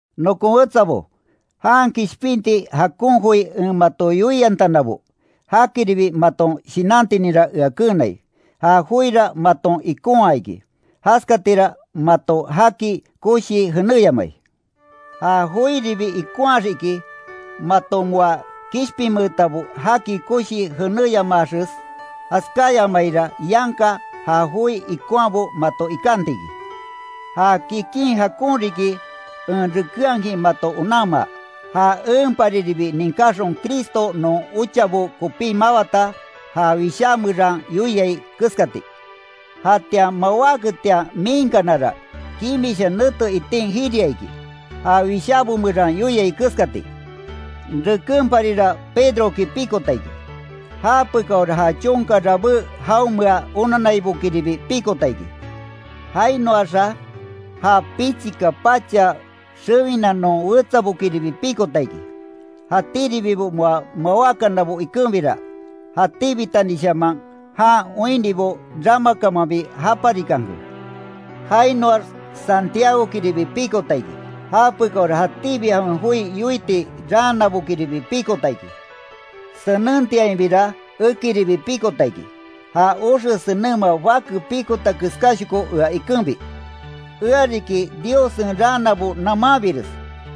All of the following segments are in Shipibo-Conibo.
Nokon wetsabo, jan kishpinti jakon joi en mato yoiantanabo, jakiribi maton shinantininra ea keenai, ja joira maton ikonhaa iki, jaskatira mato jaki koshii jenéyamai. Ja joiribi ikonhaax iki, mato moa kishpinmeetabo jaki koshii jenéyamaaxes, jaskáyamaira yanka ja joi ikonhaabo mato ikanti iki. Ja kikin jakon riki en rekenhakin mato onanmaa, ja enpariribi ninkáxon Cristo non ochabo kopí mawata, ja wishá meran yoiai keskati. Jatian mawáketian miinkanara, kimisha nete itin jiriaa iki, ja Wishábo meran yoiai keskati, Rekenparira Pedroki pikota iki, japekaora ja chonka rabé jaonmea onanaibokiribi pikota iki. Jainoaxa, ja pichika pacha xewina non wetsabokiribi pikota iki, jatíribibo moa mawákanabo ikenbira, jatíbitanishaman jan oinnibo ramakamanbi japarikanke. Jainoax Santiagokiribi pikota iki, japekaora jatíbi jawen joi yoiti raanabokiribi pikota iki, senentiainbira, ekiribi pikota iki, ja oxe senenma bake pikota keskáshoko ea ikenbi. Ea riki Diossen raanabo namanbires,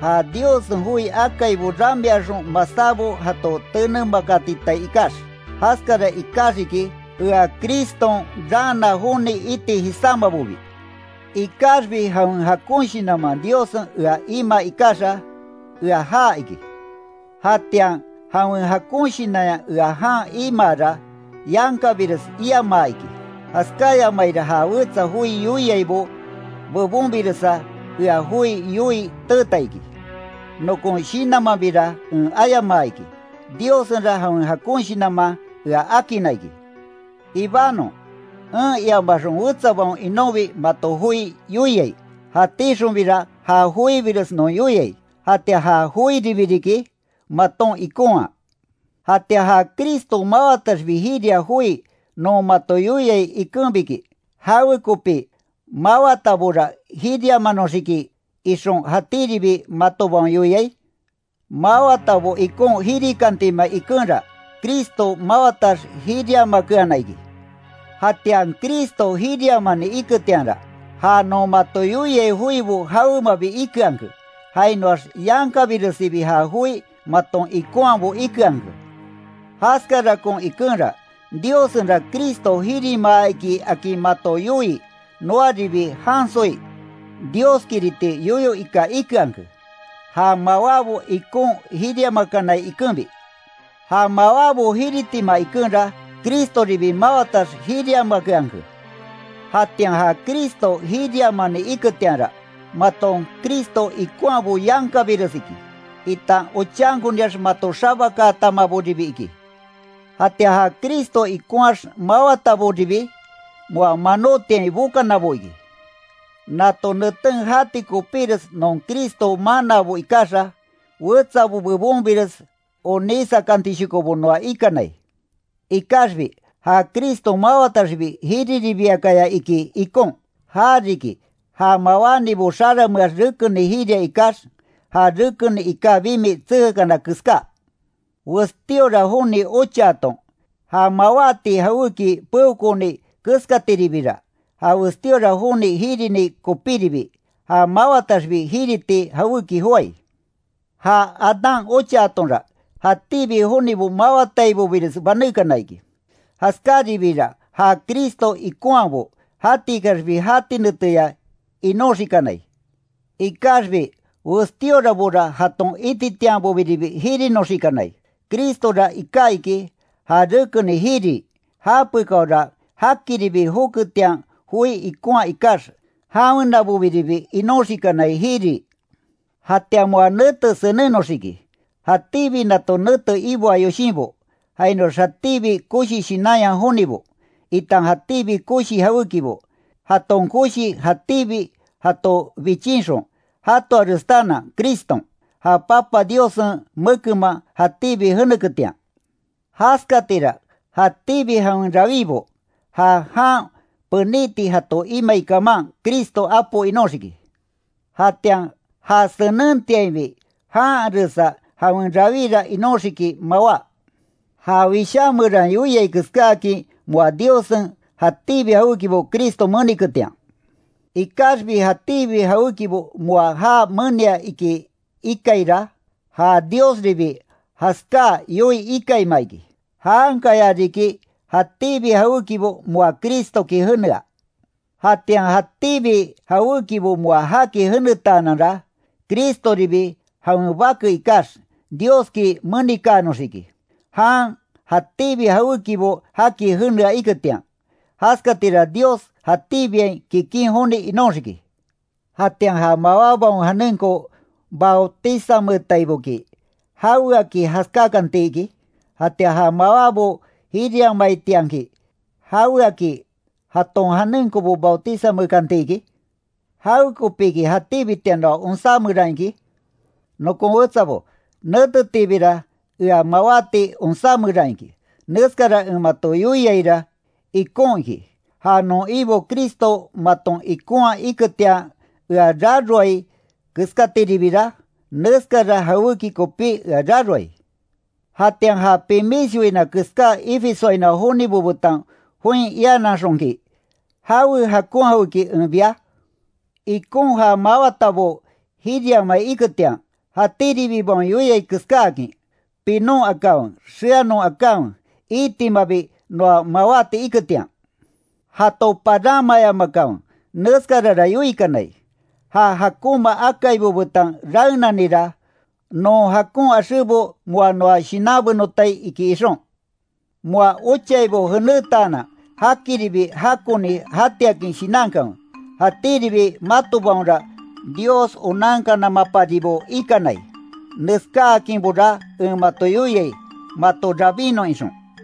ja Diossen joi akaibo ramiaxon masábo jato tenemakatitai ikax, jaskara ikaxiki, ea Criston raana joni iti jisámabobi. Ikaxbi jawen jakon shinanman Diossen ea imaa ikaxa, ea ja iki. Jatian jawen jakon shinanya ea jan imaara, yankabires iamaa iki. Jaskáyamaira ja wetsa joi yoiaibo bebonbiresa ea joi yoii teeta iki, nokon shinanmanbira en ayamaa iki, Diossenra jawen jakon shinanman ea akinna iki. Ibanon, en iamaxon wetsabaon inonbi mato joi yoiai, jatíxonbira ja joibires non yoiai, jatian ja joiribi riki, maton ikonhaa. Jatian ja Cristo mawataxbi jiria joi non mato yoiai ikenbiki, ¿Jawekopi mawatabora jiriamanoxiki, ixon jatíribi matobaon yoiai? Mawatabo ikon jirikantima ikenra, Cristo mawatax jiriamakeana iki. Jatian Cristo jiriamani iketianra, ja non mato yoiai joibo jawemabi ikeanke, jainoax yankabiresibi ja joi maton ikonhaabo ikeanke. Jaskarakon ikenra, Diossenra Cristo jirimaa iki akin mato yoii, noaribi jansoi, Dioskiriti yoyo ika ikeanke, ja mawábo ikon jiriamakanai ikenbi, ja mawábo jiritima ikenra, Cristoribi mawatax jiriamakeanke. Jatian ja Cristo jiriamani iketianra, maton Cristo ikonhabo yankabires iki, itan ochankoniax mato xabakaatamaboribi iki. Jatian ja Cristo ikonhaax mawataboribi, moa manótiain bokanabo iki. Nato neten jati kopíres non Cristo manaabo ikaxa, wetsabo bebonbires onísakantishokobo noa ikanai. Ikaxbi, ja Cristo mawataxbi jiriribiakaya iki ikon, já riki ja mawánibo xarameax rekeni jiria ikax, ja rekeni iká bimi tsekakana keská. Westíora joni ochaaton, ja mawáti jawéki peokooni keskatiribira, ja westíora joni jirini kopíribi, ja mawataxbi jiriti jawéki joái. Ja Adán ochaatonra, jatíbi jonibo mawataibobires banékana iki, jaskáribiira ja Cristo ikonhaabo, jatikaxbi jati neteya inoxikanai. Ikaxbi westíorabora jaton ititianbobiribi jirinoxikanai. Cristora iká iki, ja rekeni jirii, japekáora já jakiribi joketian joi ikonhaa ikax, jawenabobiribi inoxikanai jirii. Jatian moa nete senenoxiki, jatíbi nato nete iboa yoshinbo, jainoax jatíbi koshi shinanya jonibo, itan jatíbi koshi jawékibo, jaton koshi jatíbi jato bichinxon, jatoarestaanan Criston, ja Papa Diossen mekenman jatíbi jeneketian. Jaskatira jatíbi jawen rawíbo, ja jan peniti jato imai kaman, Cristo Apo inóxiki. Jatian ja senentiainbi janharesa jawen rawíra inóxiki mawá. Ja wishá meran yoiai keskáakin, moa Diossen jatíbi jawékibo Cristo meniketian. Ikaxbi jatíbi jawékibo moa já menia iki ikaira, ja Diosribi jaskáa yoii ikaima iki, jankaya riki jatíbi jawékibo moa Cristoki jenea. Jatian jatíbi jawékibo moa jaki jenetaananra, Cristoribi jawen Bake ikax, Dioski menikaanoxiki, jan jatíbi jawékibo jaki jenea iketian, jaskatira Dios jatíbiain kikin joni inóxiki. Jatian ja mawábaon janenko bautizanmeetaiboki ¿Jaweaki jaskákanti iki? Jatian ja mawábo jiriamaitianki ¿Jaweaki jaton janenkobo bautizanmeekanti iki? ¿Jawekopiki jatíbitian noa onsá meran iki? Nokon wetsabo, netetiibira ea mawáti onsá meran iki, neskara en mato yoiaira ikon iki. Ja non Ibo Cristo maton ikonhaa iketian ea raroai keskatiribira, neskara jawéki kopí ea raroai. Jatian ja pimis yoina keská Efesoainoa jonibo betan join iananxonki ¿Jawe jakon jawéki en bia? Ikon ja mawatabo jiriamai iketian, jatíribibaon yoiai keskáakin: “Pinon akanwe xeanon akanwe, iitimabi noa mawáti iketian”. Jato paranmayamakanwe. Neskarara yoikanai: “Ja jakonma akaibo betan raenanira, non jakon axébo moa noa shinanbenotai”, iki ixon. Moa ochaibo jenétaanan jakiribi jakoni jatiakin shinankanwe, jatíribi matobaonra Dios onankanamaparibo ikanai, neskáakinbora en mato yoiai, mato rabínnon ixon.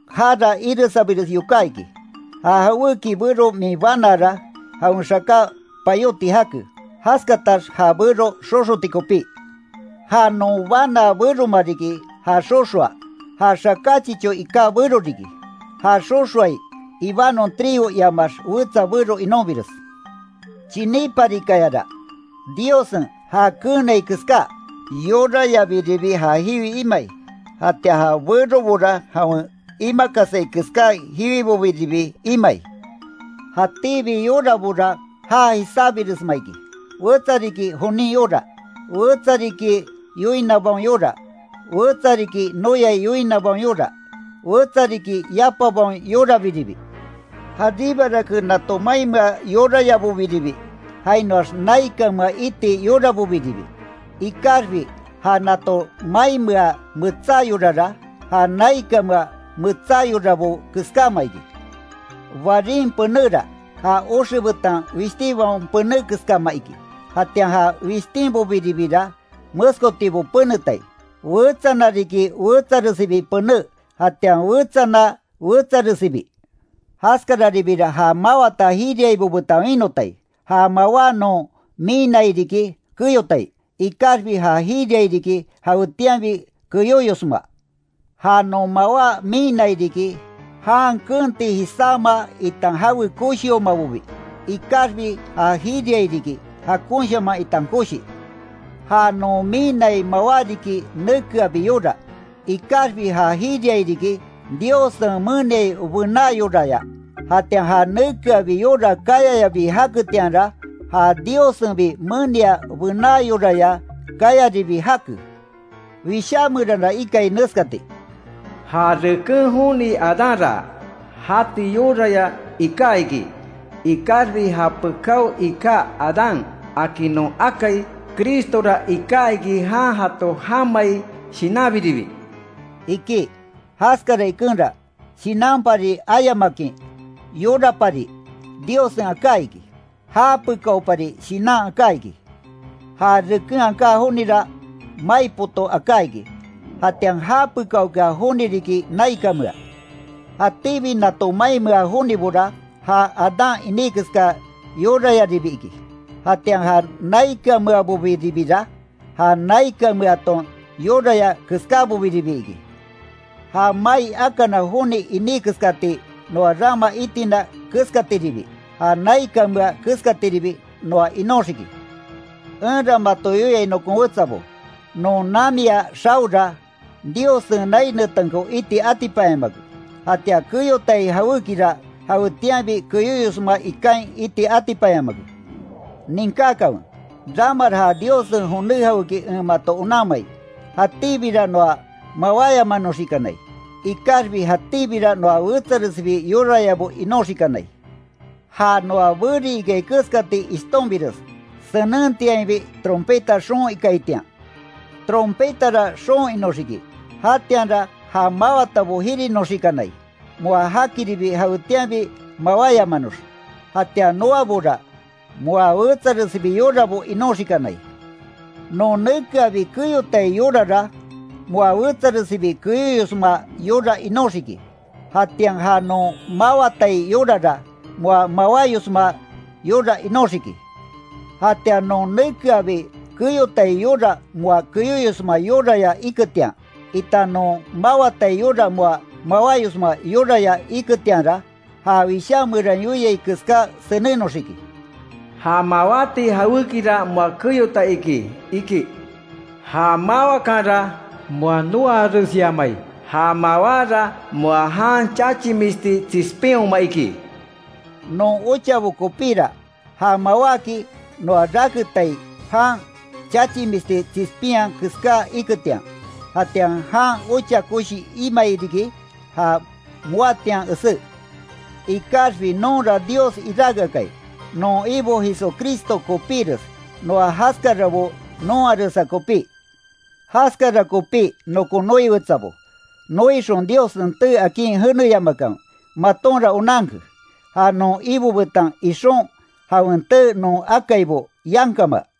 ¡Jara iresabires yoká iki! Ja jawéki bero min banaara, jawen xaká payóti jake, jaskatax ja bero xoxoti kopí. Ja non banaa beroma riki, ja xoxoa, ja xaká chichó iká bero riki, ja xoxoai, ibanon trigo iamax wetsa bero inonbires. Chiníparikayara, Diossen já keenai keská yorayabiribi ja jiwi imai, jatian ja berobora jawen imakasai keská jiwibobiribi imai. Jatíbi yorabora ja jisábiresma iki, wetsa riki jonin yora, wetsa riki yoinabaon yora, wetsa riki noyai yoinabaon yora, wetsa riki yapabaon yorabiribi. Jaribarake nato mainmea yorayabobiribi, jainoax naikanmea iti yorabobiribi, ikaxbi ja nato mainmea metsá yorara, ja naikanmea metsá yorabo keskáma iki, Barin penéra, ja oxe betan wishtinbaon pené keskama iki, jatian ja wishtínbobira meskotibo penetai, wetsana riki wetsaresibi pené jatian wetsana wetsaresibi. Jaskararibira ja mawata jiriaibo betan winotai, ja mawá non miinnai riki keyotai, ikaxbi ja jiriai riki, jawetianbi keyóyosma. Ja non mawá miinnai riki, jan keenti jisáma itan jawe koshiomabobi, ikaxbi ja jiriai riki, jakonshaman itan koshi. Ja non miinnai mawá riki nekeabi yora, ikaxbi ja jiriai riki, Diossen meniai bená yoraya. Jatian ja nekeabi yora káyayabi jaketianra, ja Diossenbi menia bená yoraya kayaribi jake. Wishá meranra ikai neskati: “Ja reken joni Adánra, jati yoraya iká iki, ikaxbi japekao iká Adán akin non akai Cristora iká iki, jan jato jamai Shinanbiribi”, iki. Jaskara ikenra, shinanpari ayamakin, yorapari Diossen aká iki, japekaopari shinan aká iki. Ja reken aká jonira, mai poto aká iká iki, jatian japekaokea joni riki naikanmea. Jatíbi nato mainmea jonibora, ja Adán iní keska yorayaribi iki, jatian ja naikanmeabobiribira, ja naikanmeaton yoraya keskáboribi iki. Ja mai akana joni iní keskati noa rama itina keskatiribi, ja naikanmea keskatiribi noa inóxiki. Enra mato yoiai nokon wetsabo, non namiya xaora, Diossen nai netenko iti atipanyamake, jatian keyotai jawékira, jawetianbi keyóyosma ikain iti atipanyamake. Ninkákanwe, ramara ja Diossen joné jawéki en mato onanmai, jatíbira noa mawáyamanoxikanai, ikaxbi jatíbira noa wetsaresibi yorayabo inoxikanai. Ja noa beri ikai keskati ishtonbires, senentiainbi trompeta xoon ikaitian. Trompetara xoon inóxiki, jatianra ja máwatabo jirinoxikanai, moa jakiribi jawetianbi mawáyamanox, jatian noabora moa wetsaresibi yorabo inoxikanai. Non nekeabi keyotai yorara, moa wetsaresibi keyóyosma yora inóxiki, jatian ja non mawatai yorara, moa mawáyosma yora inóxiki. Jatian non nekeabi keyotai yora moa keyóyosma yoraya iketian, itan non mawatai yora moa mawáyosma yoraya iketianra, ja Wishá meran yoiai keská senennoxiki: “Ja mawáti jawékira moa keyota iki iki. Ja máwakanra moa noaaresyamai, ja mawára moa jan chachimisti tsispinhoma iki”. Non ochabo kopíra, ja mawáki, noa raketai jan chachimisti tsispinya keská iketian, jatian jan ocha koshi imai riki, ja moatian esé. Ikaxbi nonra Dios iráke akai, non Ibo Jesucristo kopíres, moa jaskarabo nonharesa kopí. Jaskara kopí nokon noi wetsabo, noixon Diossen tee akin jeneyamakanwe, matonra onanke, ja non Ibo betan ixon jawen tee non akaibo, yankama.